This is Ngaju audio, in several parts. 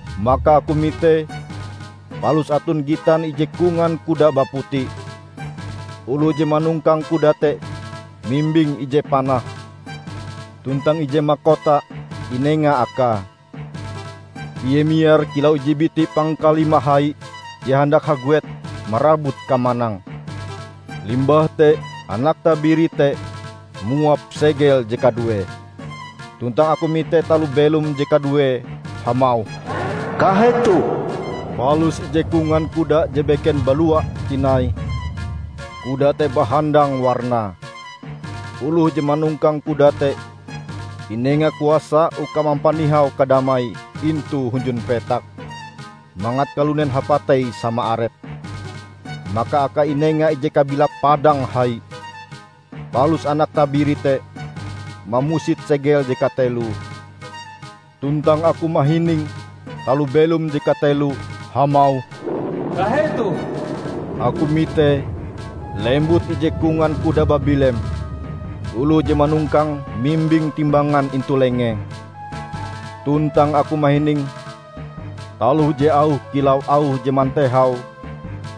Maka aku mite, palus aton gitan ije kongan kuda baputi. Oloh je manongkang kuda te mimbing ije panah, tuntang ije makota inenga akae. Ie miar kilau ije biti pangkalima hai je handak haguet marabut kamanang. Limbah te Anak Tabiri te muap segel je kaduee, tuntang aku mite taloh belom je kaduee hamauh, "Kahetoh!" Palus ije kongan kuda je beken balua tinai. Kuda te bahandang warnae. Oloh je manongkang kuda te inenga kuasa uka mampanihau kadamai intu hunjun petak, mangat kalunen hapatei sama arepe. Maka akae inenga ije kabilap padang hai. Palus Anak Tabiri te mamusit segel je kateloe. Tuntang aku mahining taloh belom je kateloe hamauh, "Kahetoh!" Aku mite, lembut ije kongan kuda babilem. Oloh je manongkange mimbing timbangan intu lengee. Tuntang aku mahining taloh je auhe kilau auh je mantehau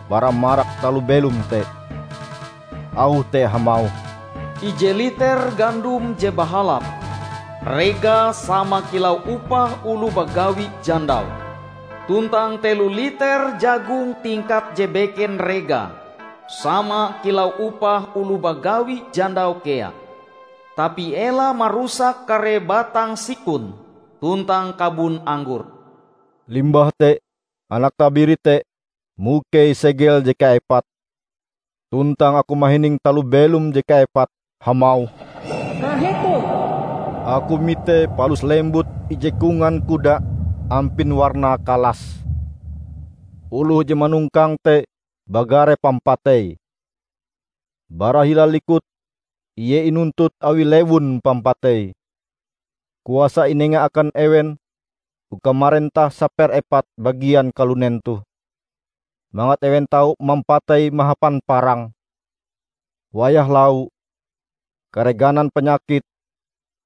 bara marak taloh belom te. Auh te hamauh, "Ije liter gandom je bahalap, regae sama kilau upah oloh bagawi jandau, tuntang telo liter jagung tingkat je beken regae sama kilau upah oloh bagawi jandau kea. Tapi ela marusak kare batang sikon tuntang kabon anggor!" Limbah te Anak Tabiri te mukei segel je kaepate. Tuntang aku mahining taloh belom je kaepate hamauh, "Kahetoh!" Aku mite palus lembut ije kongan kuda ampin warnae kalas. Oloh je manongkange te bagare Pampatei. Bara hila likute, ie inuntut awi Lewun Pampatei. Kuasa inenga akan ewen uka marentah saperepat bagian kalunen toh, mangat ewen tau mampatei mahapan parang, wayah lau, kare ganan panyakit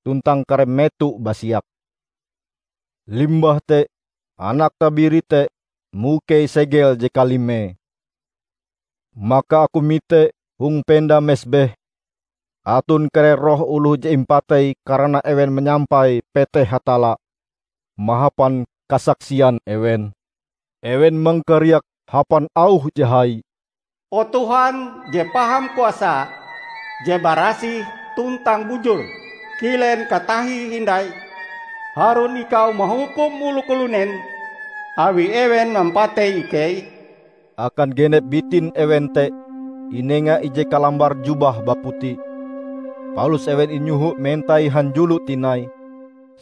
tuntang kare meto basiak. Limbah te Anak Tabiri te mukei segel je kalimee. Maka aku mite hong penda mesbeh aton kare roh oloh je impatei karana ewen manyampai peteh Hatalla mahapan kasaksian ewen. Ewen mangkariak hapan auh je hai, "O Tuhan je Paham Kuasa, je barasih tuntang bujur! Kilen katahie hindai harun ikau mahukum oloh kalunen awi ewen mampatei ikei?" Akan genep bitin ewen te inenga ije kalambar jubah baputi. Palus ewen inyoho mentai hanjulo tinai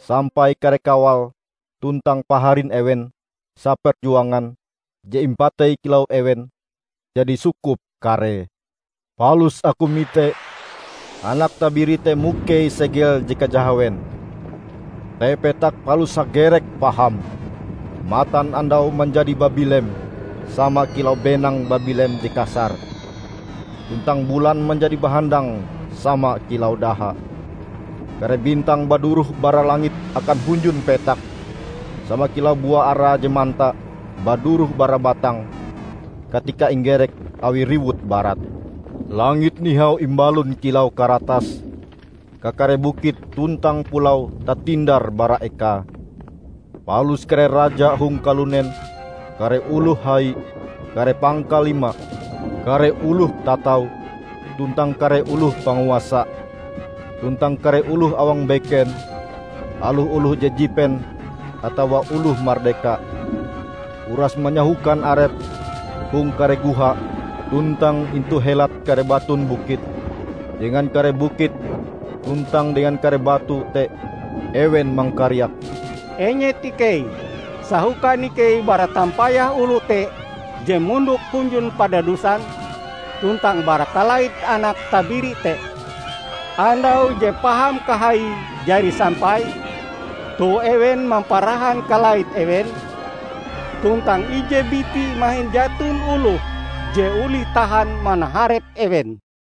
sampai kare kawal tuntang paharin ewen saperjuangan je imapatei kilau ewen jadi sukup karee. Palus aku mite Anak Tabiri te mukei segel je kajahawen. Te petak palus hagerek paham. Matanandau manjadi babilem sama kilau benang babilem je kasar, tuntang bulan manjadi bahandang sama kilau daha. Kare bintang baduroh bara langit akan hunjun petak sama kilau bua ara je manta baduroh bara batange katika inggerek awi riwut barat. Langit nihau imbalon kilau karatas, kakare bukit tuntang pulau tatindar bara ekae. Palus kare raja hong kalunen, kare oloh hai, kare pangkalima, kare oloh tatau tuntang kare oloh panguasa, tuntang kare oloh awang beken, aloh oloh je jipen atawa oloh mardeka, uras manyahokan arepe hong kare goha tuntang intu helat kare batun bukit. Dengan kare bukit tuntang dengan kare batu te ewen mangkariak, "Enyet ikei, sahokan ikei bara tampayah oloh te je mondok hunjun padadusan, tuntang bara kalait Anak Tabiri te! Andau je paham kahaie jari sampai, toh ewen mamparahan kalait ewen, tuntang ije biti mahin jaton oloh je olih tahan manaharep ewen!"